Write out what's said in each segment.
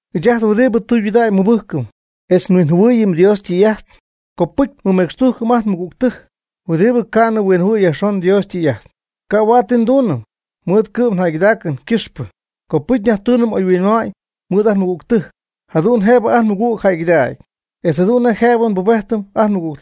Ɨɨch ajt huɨdibɨ tɨydudägy nmɨbɨjcɨm etz nhuinjɨhuɨɨyɨm Dios ytɨy'ajt, copɨcy nmɨmecxtujcɨm ajt nmɨgügtɨjc huɨdibɨ ca'nɨ huinjɨhuɨ̈y yajxon Dios ytɨy'ajt. Ca' huaad ti nduunɨm mɨɨd ngɨ'm jäygɨdaacɨn ycɨxpɨ. Copɨcy nyajtuunɨm oyhuinma'ñ mɨɨd ajt nmɨgügtɨjc, jadu'n nej jëbɨ ajt nmɨgüg jäygɨdägy, etz jadu'n nej jëbɨ nbubejtɨm ajt nmɨgüg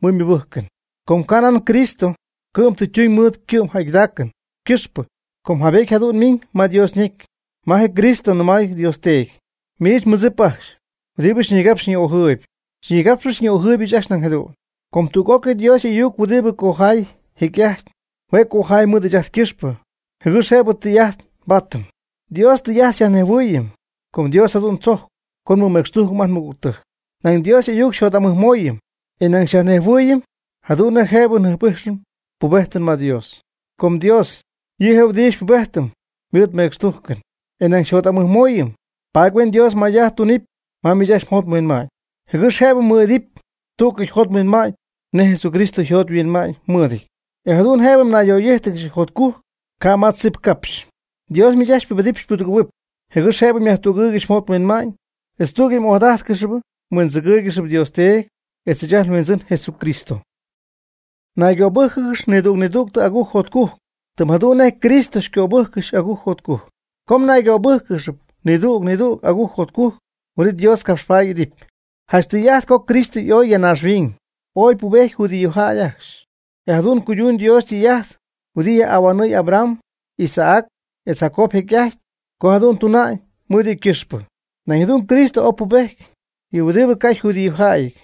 mɨɨd ymɨbɨjcɨn. Com nañ Cristo ca' ti ytuñ mɨɨd ycɨ'm jäygɨdaacɨn ycɨxpɨ, com jaybety jadu'n miñ ma Dios ñecy, ma je Cristo nɨmay Dios Teedy: “Miich mmɨdzip ajcxy huɨdibɨ xyñigapxp xyñi'ojɨɨyb, xyñigapxpɨch xyñi'ojɨɨybɨch ajcxy nañ jadu'n.” Com tüg'ócɨy Dios y'ayuc huɨdibɨ ycojay jecy'ajty, hue' cojay mɨɨd ɨɨch ajt ycɨxpɨ, jɨgɨx jëbɨ Dios ytɨy'ajt nbaatɨm. Dios ytɨy'ajt xyajnejhuɨɨyɨm co Dios jadu'n tzocy co nmɨmecxtujcɨm ajt nmɨgügtɨjc. Nañ Dios y'ayuc xyjot'amɨjmooyɨm, e nañ xyajnejhuɨɨyɨm jadu'n jëbɨ njɨjp'ijxɨm pubejtɨn ma Dios. Com Dios, yɨ' je' huɨdi xypubejtɨm mɨɨd mecxtujcɨn, e nañ xyjot'amɨjmooyɨm, paady huen Dios may'ajt tunɨpy ma miich ajcxy mjot mhuinma'ñ, jɨgɨx jëbɨ mmɨɨd'idɨpy tú'cɨy mjot mhuinma'ñ nej Jesucristo yjot yhuinma'ñ mɨɨdɨty, e jadu'n jëbɨ mnayyaj'oy'íjtɨgɨxy jotcujc ca' ma tzip capxy. Dios miich ajcxy xypubedɨpy xypudɨgɨ̈huɨpy, jɨgɨx jëbɨ myajtügɨɨygɨxy mjot mhuinma'ñ, etz tú'cɨy m'ojadájtcɨxɨpy mhuindzɨgɨ́ɨygɨxɨpy Dios Teedy etz ɨɨch ajt nHuindzɨn Jesucristo. Naygöbɨ́jcɨgɨx nidüg nidüg agujc jotcujc, tɨm jadu'n nej Cristo xycöbɨjccɨxy agujc jotcujc. Co mnaygöbɨ́jcɨgɨxɨpy nidüg nidüg agujc jotcujc, huin'it Dios capxpaady y'idɨpy. Janch tɨy'ajt co Cristo y'oy ya naaxhuiñ, oy pubety judíojäy ajcxy, e jadu'n cuyduñ Dios ytɨy'ajt huɨdi yajhuinhuanɨɨy Abraham, Isaac etz Jacob jecy'ajty co jadu'n tuna'ñ mɨɨd yɨ' ajcxy ycɨxpɨ. Nañ jadu'n Cristo ooy pubejty yɨ huɨdibɨ ca' yjudíojäyɨty,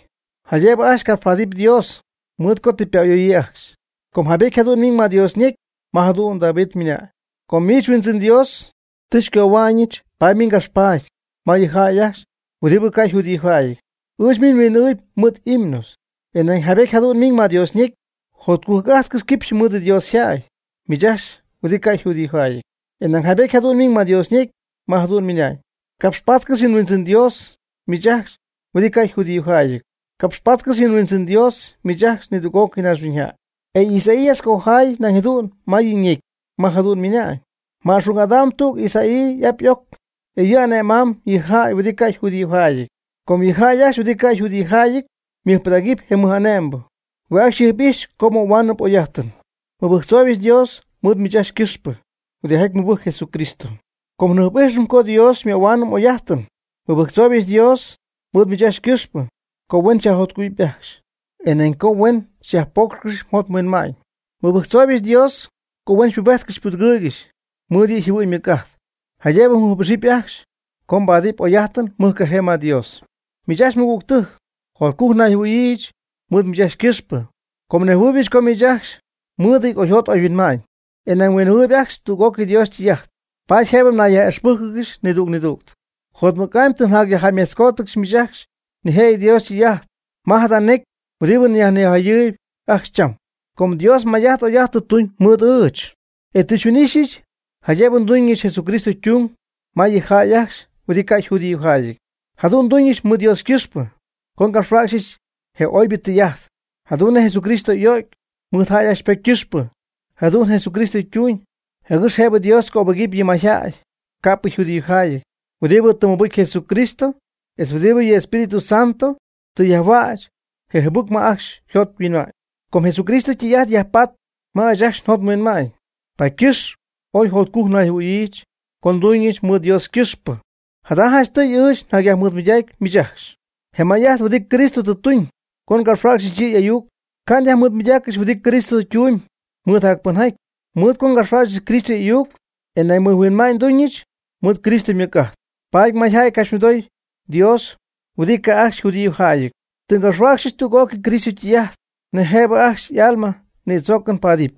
jaydëbɨ ajcxy capxpaadɨpy Dios, mɨɨd co tɨ ypa'ayoyii ajcxy. Com jaybety jadu'n ymiñ ma Dios ñecy, ma jadu'n David ymɨnañ: Com miich Huindzɨn Dios tɨ xycohua'ñɨch paady miich ngapxpaady ma yɨ jäy ajcxy huɨdibɨ ca' yjudíojäyɨty. Ɨɨch miich nhuin'ɨɨhuɨpy mɨɨd himnos. E nañ jaybety jadu'n ymiñ ma Dios yñecy: Jotcujc'ajtcɨxy quipxy mɨɨd Dios yjäy miich ajcxy huɨdi ca' yjudiojäyɨty. E nañ jaybety jadu'n ymiñ ma Dios ñecy, ma jadu'n ymɨna'ñ: Capxpaatcɨx yɨ Huindzɨn Dios miich ajcxy huɨdi ca' yjudíojäyɨty. Capxpaatcɨx yɨ Huindzɨn Dios miich ajcxy nidüg'ócɨy naaxhuiñyjäy. E Isaías ycojay nañ jadu'n ma yɨ' ñecy, ma jadu'n ymɨna'ñ: Ma'xung'adamb tüg Isaí y'ap y'oc, e yɨ' ane'mamb yɨ jäy huɨdibɨ ca' yjudíojäyɨty. Co yɨ jäy ajcxy huɨdibɨ ca' yjudíojäyɨty mɨjpɨdägɨpy je mɨj'ane'mbɨ, hue' ajcxy yjɨjp'ijxpy co möhuaanɨp oy'ajt. Nmɨbɨjctzooybɨch Dios mɨɨd miich ajcxy ycɨxpɨ huɨdijaty mɨbɨjcp Jesucristo, com njɨjp'ijxɨm co Dios xymöhuaanɨm oy'ajtɨn. Nmɨbɨjctzooybɨch Dios mɨɨd miich ajcxy ycɨxpɨ co huen xyajjotcugɨ̈huɨp ajcxy, e nañ co huen xyajpoocxɨpy mjot mhuinma'ñ. Nmɨbɨjctzooybɨch Dios co huen xypubejtcɨxy xypudɨgɨɨygɨxy mɨɨd yɨ' yjɨhuɨ'ñ ymɨc'ajt, jaydëbɨ mjɨjp'ixɨpy ajcxy co mbaadɨp oy'ajtɨn mɨjcajee ma Dios. Miich ajcxy mɨgügtɨjc, jotcujc nayjɨhuɨ̈yiijɨch mɨɨd miich ajcxy ycɨxpɨ, com nejhuɨɨybɨch co miich ajcxy mɨɨdɨty oyjot oyhuinma'ñ, e nañ mhuinjɨhuɨɨyb ajcxy tüg'ócɨy Dios ytɨy'ajt, paady jëbɨ mnayyaj'ixpɨ́jcɨgɨxy nidüg nidüg. Jotmɨc'amy tɨ nyajjäymejtzcoodyɨch miich ajcxy nijëjɨty Dios ytɨy'ajt ma jada necy huɨdi nyajnijayɨɨyb ajcxy cham, com Dios may'ajt oy'ajt tɨ tuñ mɨɨd ɨɨch, e tɨ xyhuin'ixyɨch jaydëbɨ nduñɨch Jesucristo ytung ma yɨ jäy ajcxy huɨdi ca' yjudíojäyɨty. Jadu'n nduñɨch mɨɨd Dios ycɨxpɨ, co ngapxhuäcxyɨch je oybɨ tɨy'ajt jadu'n nej Jesucristo y'o'cy mɨɨd jäy ajcxy ypocy ycɨxpɨ. Jadu'n Jesucristo ytuñ jɨgɨx jëbɨ Dios cöbɨgɨpy yɨ mayjäy ca'pɨ yjudíojäyɨty huɨdi tɨ mɨbɨcy Jesucristo etz huɨdibɨ yɨ Espíritu Santo tɨ yajhuäch je jɨbɨcp ma ajcxy yjot yhuinma'ñ. Com Jesucristo ytɨy'ajt yajpaatp ma ɨɨch njot nhuinma'ñ, paady ycɨxp ooy jotcujc nayjɨhuɨ̈yiijɨch co nduñɨch mɨɨd Dios ycɨxpɨ. Jada janchtɨy ɨɨch nyajmɨɨdmɨydacy miich ajcxy je may'ajt huɨdi Cristo tɨ tuñ co ngapxhuäcxɨch yɨ' y'ayuc. Ca' nyajmɨɨdmɨydaaccɨxy huɨdi Cristo ytumyb mɨɨd jacpɨnjaty. Mɨɨd co ngapxhuäcxɨch Cristo y'ayuc, e nañ mɨjhuinma'ñ ndumybɨch mɨɨd Cristo ymɨc'ajt, paady mayjäy ycapxymɨdooyb Dios huɨdi ca'p ajcxy yjudíojäyɨty. Tɨ ngapxhuäcxyɨch tüg'ócɨy Cristo ytɨy'ajt nej jëbɨ ajcxy y'alma ñïdzoocɨn paadɨp.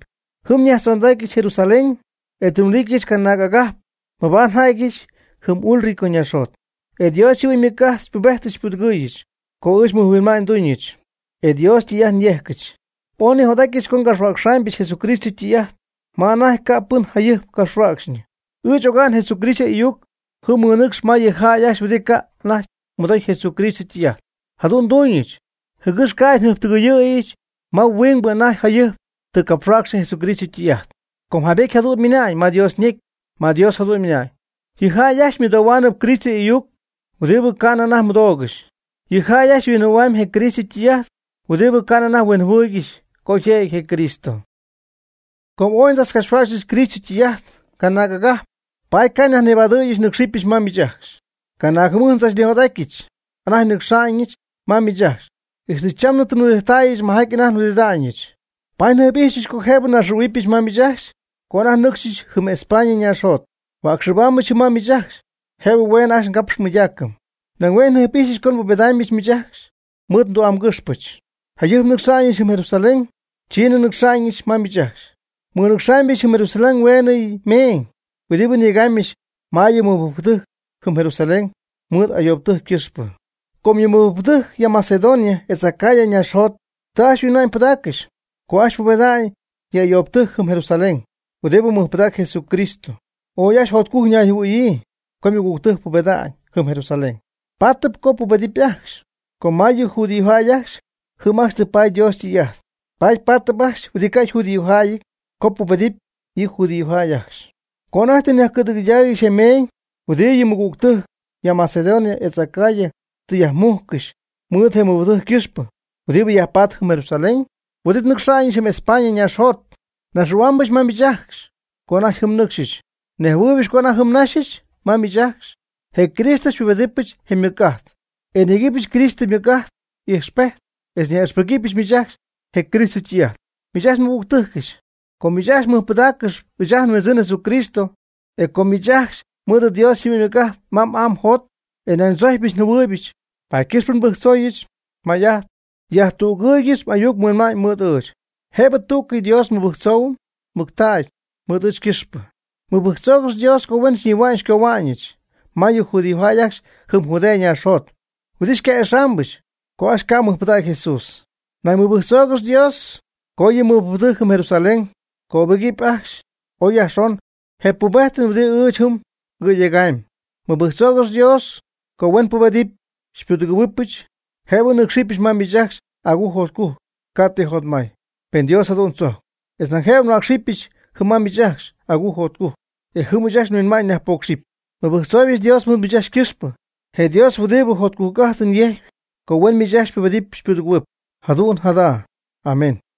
Jɨm nyajtzondacyɨch Jerusalén, e tɨ nhuɨdijttäyɨch canaag agajp mabaad nja'tyɨch jɨm Ilirico ñaaxjot. E Dios yjɨhuɨ'ñ ymɨc'ajt xypubejtɨch xypudɨgɨɨyɨch co ɨɨch mɨjhuinma'ñ nduñɨch, etz Dios ytɨy'ajt nyéjcɨbɨch. Ooy nijot'atyɨch co ngapxhuäcxɨbyɨch Jesucristo ytɨy'ajt ma anajty ca' pɨn jayɨjp capxhuäcxyñɨ. Ɨɨch oga'n Jesucristo y'ayuc jɨm nmɨnɨcxɨ ma yɨ jäy ajcxy huɨdi ca' anajty mɨdoy Jesucristo ytɨy'ajt. Jadu'n nduuñɨch, jɨgɨx ca'ydɨ njɨjptɨgɨyɨ̈yɨch ma huingbɨ anajty jayɨjp tɨ capxhuäcxɨ Jesucristo ytɨy'ajt. Com jaybety jadu'n ymiñ ma Dios ñecy, ma Dios jadu'n ymɨna'ñ: Yɨ jäy ajcxy ymɨdohuaanɨp Cristo y'ayuc huɨdibɨ ca'nɨ anajty mɨdoogɨxy. Yɨ jäy ajcxy yhuinjɨhuɨ̈huaamyb je Cristo ytɨy'ajt huɨdibɨ ca'nɨ anajty nejhuɨɨygɨxy co yjiijɨty je Cristo. Com ooy ndzachcapxhuäcxɨch Cristo ytɨy'ajt canaag agajp, paady ca' nyajnibadɨ̈yɨch nɨ́cxɨbyɨch ma miich ajcxy. Canaag jɨmɨjt ndzachnijot'atyɨch anajty nɨcxa'ñɨch ma miich ajcxy. Ixtɨ chamnɨ tɨ nhuɨdijttäyɨch majaty anajty nhuɨdida'ñɨch. Paady njɨjp'ijxypɨch co jëbɨ nnaxɨ̈huɨbɨch ma miich ajcxy co anajty nɨcxyɨch jɨm España ñaaxjot. Huäcxɨbaambɨch jɨm ma miich ajcxy jëbɨ hueenɨ ajcxy ngapxɨm nmɨydaacɨm. Nañ hue' njɨjp'ijxypɨch co xypubedaambɨch miich ajcxy mɨɨd ndu'amgɨxpɨch. Jayɨjp nnɨcxa'ñɨch jɨm Jerusalén, chiinɨ nnɨcxa'ñɨch ma miich ajcxy. Nmɨnɨcxaamybɨch jɨm Jerusalén hueenɨ meeñ huɨdibɨ nyegaamybɨch ma yɨ mɨbɨjcpɨdɨjc jɨm Jerusalén mɨɨd ayoobtɨjc ycɨxpɨ. Com yɨ mɨbɨjcpɨdɨjc ya Macedonia etz Acaya ñaaxjot tɨ ajcxy yhuinma'ñ pɨdaaccɨxy co ajcxy pubeda'ñ yɨ ayoobtɨjc jɨm Jerusalén huɨdibɨ mɨjpɨdacp Jesucristo. Ooy ajcxy jotcujc ñayjɨhuɨ̈yii co ymɨgügtɨjc pubeda'ñ jɨm Jerusalén. Paatɨp co pubedɨpy ajcxy, com ma yɨ judíojäy ajcxy, jɨm ajcxy tɨ paady Dios ytɨy'ajt, paady paatɨp ajcxy huɨdi ca' yjudíojäyɨty co pubedɨpy yɨ judíojäy ajcxy. Co anajty tɨ nyajcɨ̈dɨgɨydaaygɨxy je meeñ huɨdibɨ yɨ mɨgügtɨjc ya Macedonia etz Acaya tɨ yajmujccɨxy mɨɨd je mɨbɨjcpɨdɨjc ycɨxpɨ huɨdibɨ yajpatp jɨm Jerusalén, huin'it nnɨcxa'ñɨch jɨm España ñaaxjot. Nnaxɨ̈huaambɨch ma miich ajcxy co anajty jɨm nnɨcxɨch. Nejhuɨɨybɨch co anajty jɨm naxɨ̈yɨch ma miich ajcxy, je Cristo xypubedɨpɨch je ymɨc'ajt, e nyegɨpɨch Cristo ymɨc'ajt ijxpejt etz nyaj'ixpɨgɨpyɨch miich ajcxy je Cristo ytɨy'ajt. Miich ajcxy nmɨgügtɨjcɨch, com miich ajcxy mɨjpɨdaaccɨxyp ɨɨch ajt nHuindzɨn Jesucristo, e com miich ajcxy mɨɨd Dios yjɨhuɨ'ñ ymɨc'ajt ma m'aa mjot, e nañ xychojcpɨch xyjɨhuɨɨybɨch, paady ycɨxp nbɨjctzooyɨch may'ajt, yajtügɨɨygɨxy m'ayuc mhuinma'ñ mɨɨd ɨɨch, jëbɨ tú'cɨy Dios nmɨbɨjctzoohuɨm mɨctägy mɨɨd ɨɨch ycɨxpɨ. Mɨbɨjctzoogɨx Dios co huen xyñihua'ñɨch xycohua'ñɨch ma yɨ judíojäy ajcxy jɨm Judea naaxjot, huɨdibɨ xyca'ixaambɨch co ajcxy ca' mɨjpɨdägy Jesús. Nañ mɨbɨjctzoogɨx Dios co yɨ mɨbɨjcpɨdɨjc jɨm Jerusalén cöbɨgɨpy ajcxy oy yajxon je pubejtɨn huɨdibɨ ɨɨch jɨm ngɨ̈yegaamy. Mɨbɨjctzoogɨx Dios co huen xypubedɨpy xypudɨgɨ̈huɨbɨch, jëbɨ nɨ́cxɨbɨch ma miich ajcxy agujc jotcujc, ca' ti jotmay, pen Dios jadu'n tzojcp, etz nañ jëbɨ nhuäcxɨbɨpɨch jɨm ma miich ajcxy agujc jotcujc, e jɨm ɨɨch nhuinma'ñ nyajpocxɨp. Mɨbɨjctzooybɨch Dios mɨɨd miich ajcxy ycɨxpɨ, je Dios huɨdibɨ jotcujc'ajtɨn yejcp, co huen miich ajcxy xypubedɨpy xypudɨgɨ̈huɨpy. Jadu'n jadu'n. Amén.